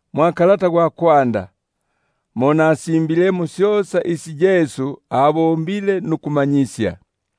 Mwa kalata gwa kwanda, gwe Teofili, mo nakusimbilemo syosa isi Yesu alyandile ukubomba nukumanyisya,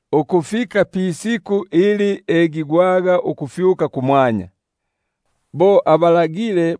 ukufika pisiku ili afyusigwaga kumwanya, bo abalagilile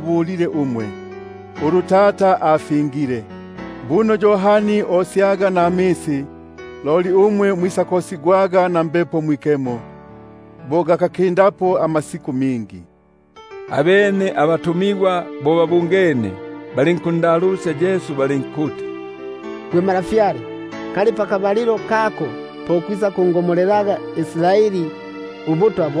Tata, ulu mwalupilike kumyangu; buno Yohani osyaga namisi, loli umwe mwisakosigwaga mwa Mbepo Mwikemo, bo gakakindapo amasiku mingi. Abene lelo bo babungene, balinkundalusya balinkuti: Gwe Ntwa, pakabalilo kako po kwisakungomolelaga Israeli ubutwa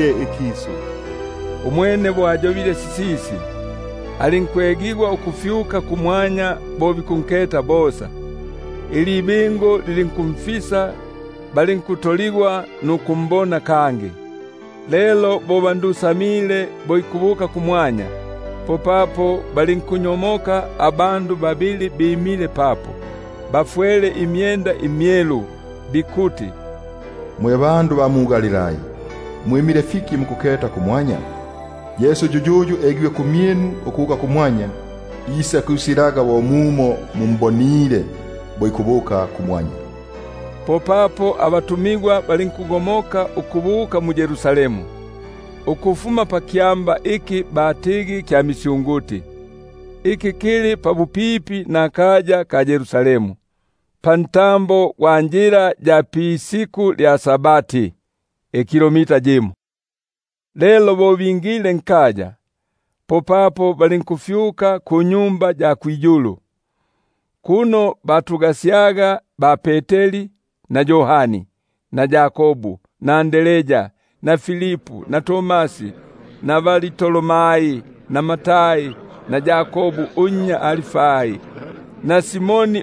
ikisu. Umwene bo ayobile sisisi, alinkufyusigwa bo bikuketa, ilibingu lilinkunsosyako kumaso gabo. Lelo bo bandusamile bo ikubuka kumwanya, popapo balinkunyomoka abandu babili bimile papo, bafwele imyenda imyelu, bikuti: Mwe bandu ba mu-Galilai, mwimile fiki nukuketa kumwanya? Yesu yuyuyu, uyu afyusigwe kumwanya ukufuma kumyinu, isakwisaga bo mumo mumbonile ukubuka kumwanya. Popapo balinkugomoka ukubuka mu-Yerusalemu, ukufuma pakyamba iki batigi kya misyunguti, iki kili pabupipi na Yerusalemu, pantambo gwa njila ya pa-Sabati. Lelo bo bingile, popapo balinkufyuka kunyumba ya kwiyulu, kuno batusyaga ba-Peteri na Yohani, Yakobu na Andrea, Filipu na Tomasi, Bartolomai na Matai, Yakobu unnya Alfai na Simoni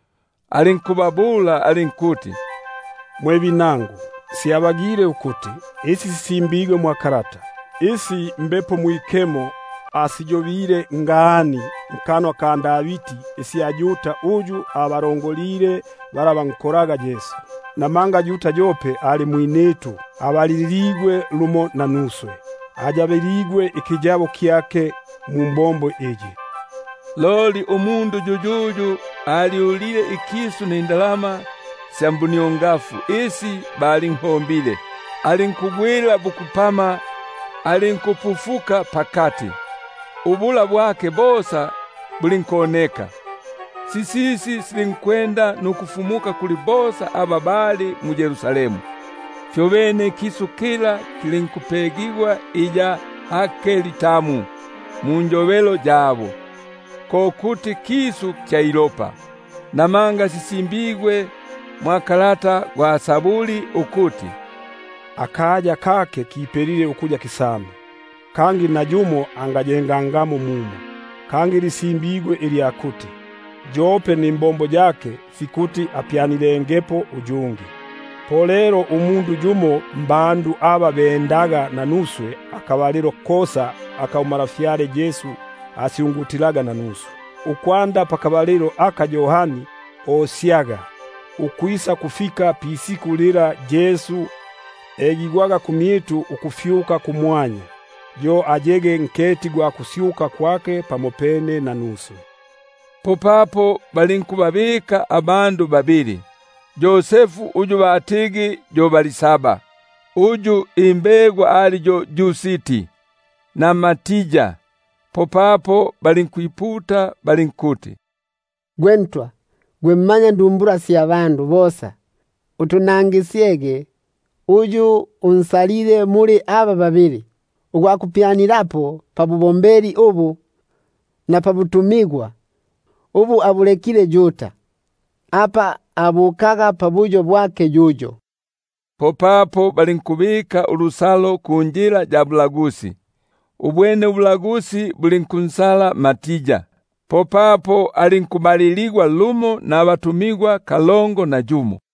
alinkubabula alinkuti: Mwe binangu, syabagile ukuti isi sisimbigwe sisege, isi Mbepo Mwikemo asiyobile ngani nkanwa mwa Davidi, isya Yuda uyu abalongolile aba banko- laga Yesu; namanga yope abaliligwe lumo nanuswe, ayabi- ligwe ikiyabo kyake mumbombo iyi. (Loli umundu yuyuyu alyulile ikisu nifihombigwa fya buniongafu, alinkugwila bukupama, alinkupufuka pakati, ubula bwake bosa bulinkoneka. Sisisi silinkwenda nukufumuka kuli bosa aba bali mu-Yerusalemu, fyobene ikisu kila kilinkupegwa iya Hakeldama munjo- belo yabo; ko kuti kisu kya ilopa). Namanga sisimbigwe mwa kalata gwa nyimbo sya Israeli ukuti: Akaya kake kipelege ukuya kisame, Kangi nayumo angayengangamo mumo; nilya kuti: Yope nimbombo yake fikuti apyanilengepo uyungi. Lelo mbandu aba bendaga nanuswe akabalilo kosa aka uNtwa Yesu ingilaga nukusoka mmyitu, ukwanda palosyo lwa Yohani, ukwisakufika pisiku fila afyusigwege kumwanya ukufuma kumyitu, fikuti yumo mmyabo ayege nketi gwa kusyuka kwake pamopene nanuswe. Popapo balinkubabika babili, Yosefu uyu batigi yo Barsaba, uyu imbegwa ali yo Yusti, na Matia. Popapo balinkwiputa balinkuti: Gwe Ntwa, gwe mmanyandumbula sya bosa, utunangisyege uyu unsalile muli aba babili, ugwa kupyanilapo pabubombeli ubu, na pabutumigwa ubu abulekile Yuda, apa abukaga pabuyo bwake yuyo. Popapo balinkubabikila ubulagusi, ubwene ubulagusi bulinkunkola Matia; popapo alinkubaliligwa lumo nabatumigwa kalongo na yumo.